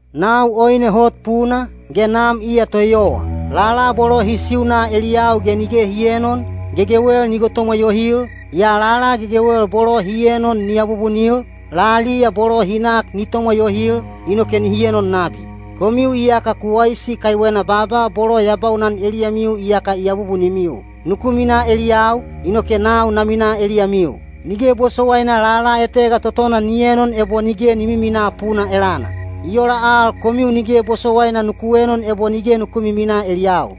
“Nau oine hot puna, ge Nam iya toeyowa. Lala bolo hi siuna eliyau ge nige hi eenon, gegewel ni gotomwa yohil, yaa lala gegewel bolo hi enon ni abubunil, laliya bolo hi nak ni tomwa yohil, inoke nihi enon nabi. Komiu iyaka ku waisi kaiwena baaba bolo ya baunan eliyamiu iyaka i abubunimiu. Nuku minaa eliyau, inoke nau na minaa eliyamiu. Nige bosowaina lala etega totona ni enon ebo nige ni miminaa puna elana. I ola al komiu nige bosowaina nuku enon ebo nige nuku miminaa eliyau.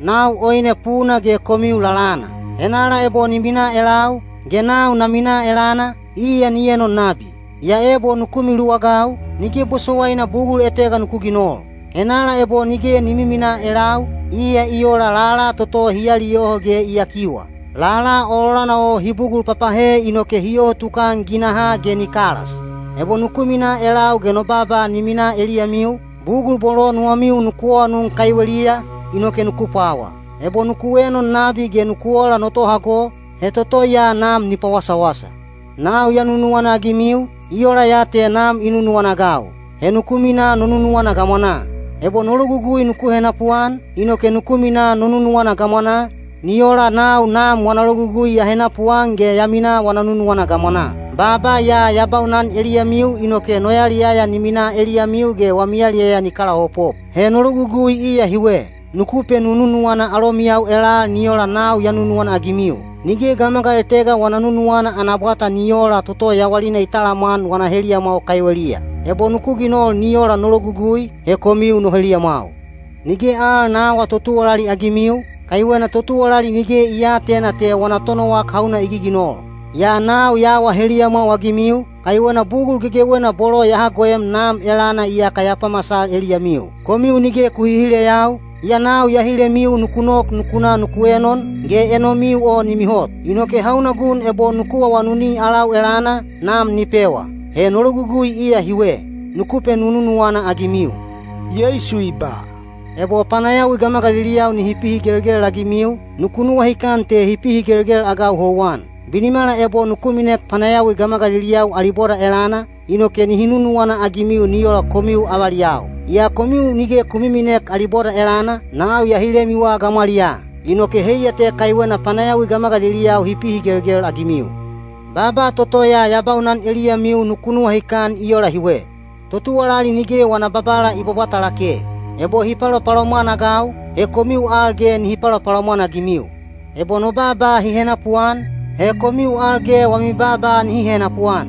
“Nau oine puna ge komiu lalana. Henala ebo ni minaa elau, ge nau na minaa elana, iya ni enon nabi. Yaa ebo nuku miluwagau, nige bosowaina bugul etega nuku ginol. Henala ebo nige ni miminaa elau, iya i ola lala toto hi aliyoho ge i yakiwa. Lala ololana o hi bugul papahe inoke hi yoho tukan ginahaa ge nihi kalas. Ebo nuku minaa elau ge no baaba ni minaa eliyamiu, bugul bolo nuwamiu nuku awanun kaiweliya, inoke nuku pwawa. Ebo nuku enon nabi ge nuku ola no tohago, he toto ya Nam ni pawasawasa. “Nau ya nunuwana-agimiu, i ola ya te Nam i nunuwana-agau. He nuku minaa no nunuwana gamwanaa. Ebo no logugui nuku henapuan, inoke nuku minaa no nunuwana gamwanaa, ni ola nau Nam wana logugui ya henapuan ge ya minaa wana nunuwana gamwanaa. Baaba ya ya baunan eliyamiu inoke no yaliyaya ni mina eliyamiu ge wami yaliyaya ni pakalaopop. He no logugui iya hiwe: nuku penununuwana alomiyau elal ni ola nau ya nunuwana-agimiu. Nige gamagal etega wana nunuwana ana bwata ni oola toto yawalina i talamwan wana heliyamwau kaiweliya. Ebo nuku ginol ni ola no logugui, he komiu no heliyamwau. Nige al na aawa totuwalali-agimiu, kaiwena totuwalali nige i aatena te wana tonowak hauna i giginol. Yaa nau ya awa heliyamwau-agimiu, kaiwena bugul gegewena bolo ya hagoem Nam elana iyaka ya pamasal eliyamiu. Komiu nige ku hihileyau, yaa nau ya hilemiu nuku nok nuku na nuku enon, ge enomiu o ni mihot. Inoke hauna gun ebo nuku awanuni alau elana, Nam ni pewa. He no logugui iya hiwe: nuku penununuwana-agimiu.” Yeisu i ba, “Ebo panayawi gamagaliliyau nihi pihigelgel-agimiu, nuku nuwahikan te hi pihigelgel-agau houwan. Binimala ebo nuku minek panayawi gamagaliliyau ali boda elana, inoke nihi nunuwana-agimiu ni ola komiu avaliyau. Yaa komiu nige ku miminek ali boda elana, nau ya hilemiwa gamwaliyaa. Inoke heiya te kaiwena panayawi gamagaliliyau hi pihigelgel-agimiu. Baaba toto ya baunan eliyamiu nuku nuwahikan i ola hiwe: ‘Totuwalali nige wana babala i bwabwata lake.’ Ebo hi palopalomwan-agau, he komiu al ge nihi palopalomwan-agimiu. Ebo no baaba hi henapuan, he komiu al ge wami baaba nihi henapuan.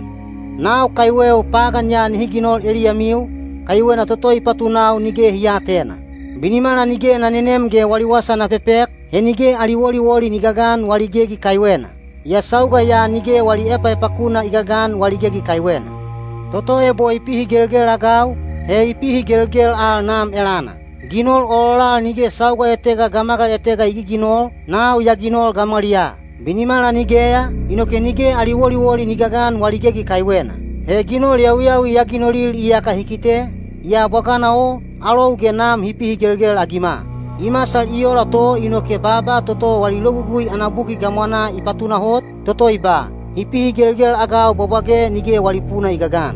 Nau kaiweu pagan ya nihi ginol eliyamiu, kaiwena toto i patunau nige hi aatena. Binimala nige na nenem ge wali wasa na pepek, he nige ali woliwoli ni gagan wali gegi kaiwena. Yaa sauga ya nige wali epaepakuna i gagan wali gegi kaiwena. Toto ebo i pihigelgel-agau, he i pihigelgel al Nam elana. Ginol ololal nige sauga etega gamagal etega i giginol, nau ya ginol gamwaliyaa. Binimala nigeya, inoke nige ali woliwoli ni gagan wali gegi kaiwena. He ginol yawiyawi ya ginolil iyaka hi kite, yaa bwagana o, alou ge Nam hi pihigelgel-agima. I masal i ola to inoke baaba toto wali Logugui ana buki gamwanaa i patunahot, toto i ba, ‘Hi pihigelgel-agau bwabwage nige wali puna i gagan.’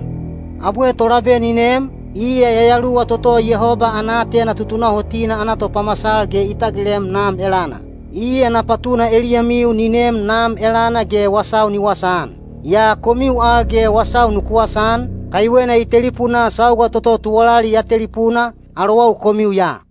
“Abwe Tolabe ni nem, iya Yayaluwa toto Yehoba ana aatena tutunahotina ana topamasal ge i tagilem Nam elana. Iya na patuna eliyamiu ni neem Nam elana ge wasau ni wasaan. Yaa komiu al ge wasau nuku wasaan, kaiwena i telipunaa sauga toto tuwalali ya telipuna, alowau komiu ya.